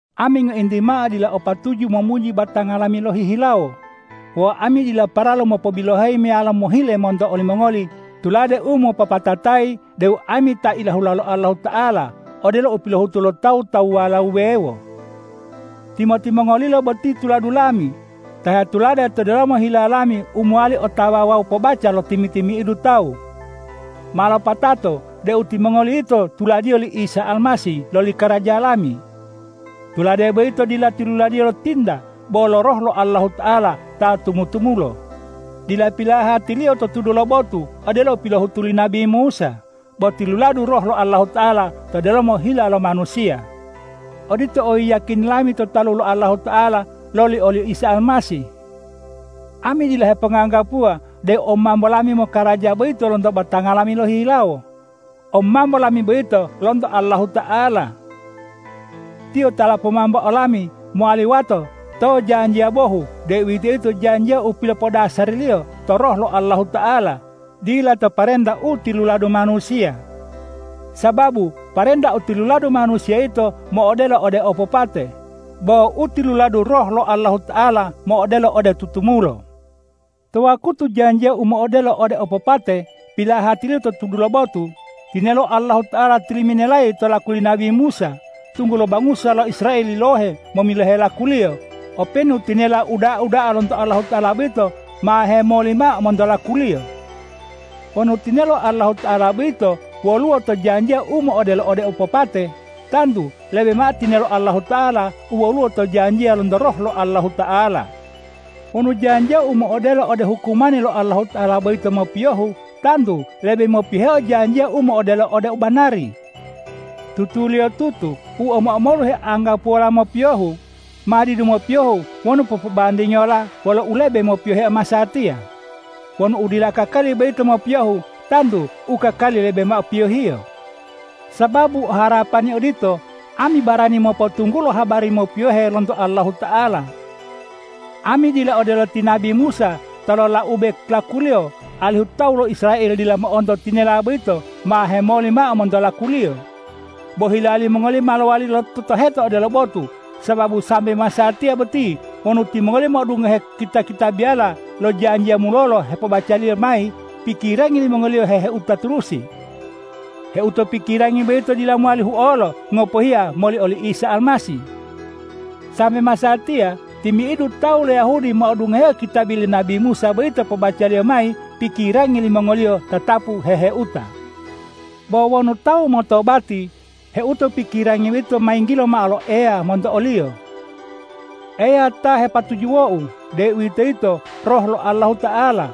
Ami ngointi mao dila o patuju momuji batanga lami lohihilawo. Wawu ami dila paralu mopobiloheyi meyalo mohile monto olimongoli tulade u mopopatatayi deu ami ta ilahula lo Allahuta'ala, odelo u pilohutu lo tawu-tawuwala wuwewo. Timo-timongolilo boti tuladu lami, ta hetulade to delomo hila lami u mowali otawa wawu pobaca lo timi-timi'idu tawu. Ma lopatato deu timongoli yito tuladiyo li Isa Almasih loli karaja lami. Tulade boyito dila tiluladiyo lo tinta bo lo Roh lo Allahuta'ala ta tumu-tumulo; dila pilahati-Liyo to tudu lo botu odelo u pilohutu li nabi Musa, bo tiluladu Roh lo Allahuta'ala to delomo hila lo manusiya. Odito oyiyakini lami to talu lo Allahuta'ala loli oli Isa Almasih. Ami dila heponganggapuwa deu omambo lami mokaraja boyito lonto batanga lami lohihilawo. Omambo lami boyito lonto Allahuta'ala. Tiyo ta lopomambo olami mowali wato to janjiya bohu, deuwitoyito janjiya u pilopodasariliyo to Roh lo Allahuta'ala, dila to parenta u tiluladu manusiya. Sababu parenta u tiluladu manusiya yito mo'odelo ode opopate, bo u tiluladu Roh lo Allahuta'ala mo'odelo ode tutumulo. To wakutu janjiya u mo'odelo ode opopate pilahatiliyo to tudu lo botu, tinelo Allahuta'ala tilimenelayi to laku li nabi Musa, tunggulo bangusa lo Israel yilohe momilohe lakuliyo, openu tinela u uda'a da'a lonto Allahuta'ala boyito ma hemoli mao monto lakuliyo. Wonu tinelo Allahuta'ala boyito woluwo to janjiya u mo'odelo ode opopate, tantu lebe mao tinelo Allahuta'ala u woluwo to janjiya lonto Roh lo Allahuta'ala. Wonu janjiya u mo'odelo ode hukumani lo Allahuta'ala boyito mopiyohu, tantu lebe mopiyoheo janjiya u mo'odelo ode u banari. Tutuliyotutu u omo-omolu heanggapuwola mopiyohu, ma didu mopiyohu wonu popobandingiyola wolo u lebe mopiyoheo masatiya. Wonu udila kakali boyito mopiyohu, tantu u kakali lebe mao piyohiyo. Sababu o harapani odito, ami barani mopotunggulo habari mopiyohe lonto Allahuta'ala. Ami dila odelo ti nabi Musa ta lolaube lakuliyo, alihu tawu lo Israel dila mo'onto tinela boyito ma hemoli mao monto lakuliyo. Bo hila limongoliyo ma lowali lototoheta odelo botu, sababu sambe masatiya boti wonu timongoliyo mo'odungohe kita-kitabiyala lo janjiya mulolo hepobacaliyo mayi, pikirangi limongoliyo heheuta turusi. Heuto pikirangi boyito dila mowali huolo, ngopohiya moli oli Isa Almasih. Sambe masatiya timi'idu tawu lo Yahudi mo'odungohe kitabi li nabi Musa boyito pobacaliyo mayi pikirangi limongoliyo tatapu heheuta. Bo wonu tawu motobati, heuto pikirangi boyito ma yinggilo mao lo Eya monto oliyo. Eya ta hepatujuwou, deuwitoyito Roh lo Allahuta'ala.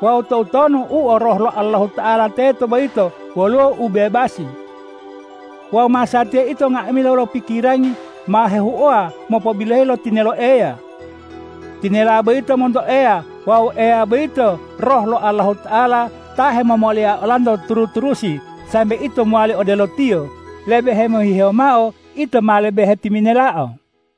Wawu toutonu u o Roh lo Allahuta'ala teto boyito woluwo ubebasi. Wawu masatiya ito nga'amila wolo pikirangi ma hehuowa mopobiloheyi lo tinelo Eya. Tinela boyito monto Eya wawu Eya boyito Roh lo Allahuta'ala ta hemomolia olanto turu-turusi sambe ito mowali odelo Tiyo, lebe hemohihewo mao ito ma lebe hetiminelao.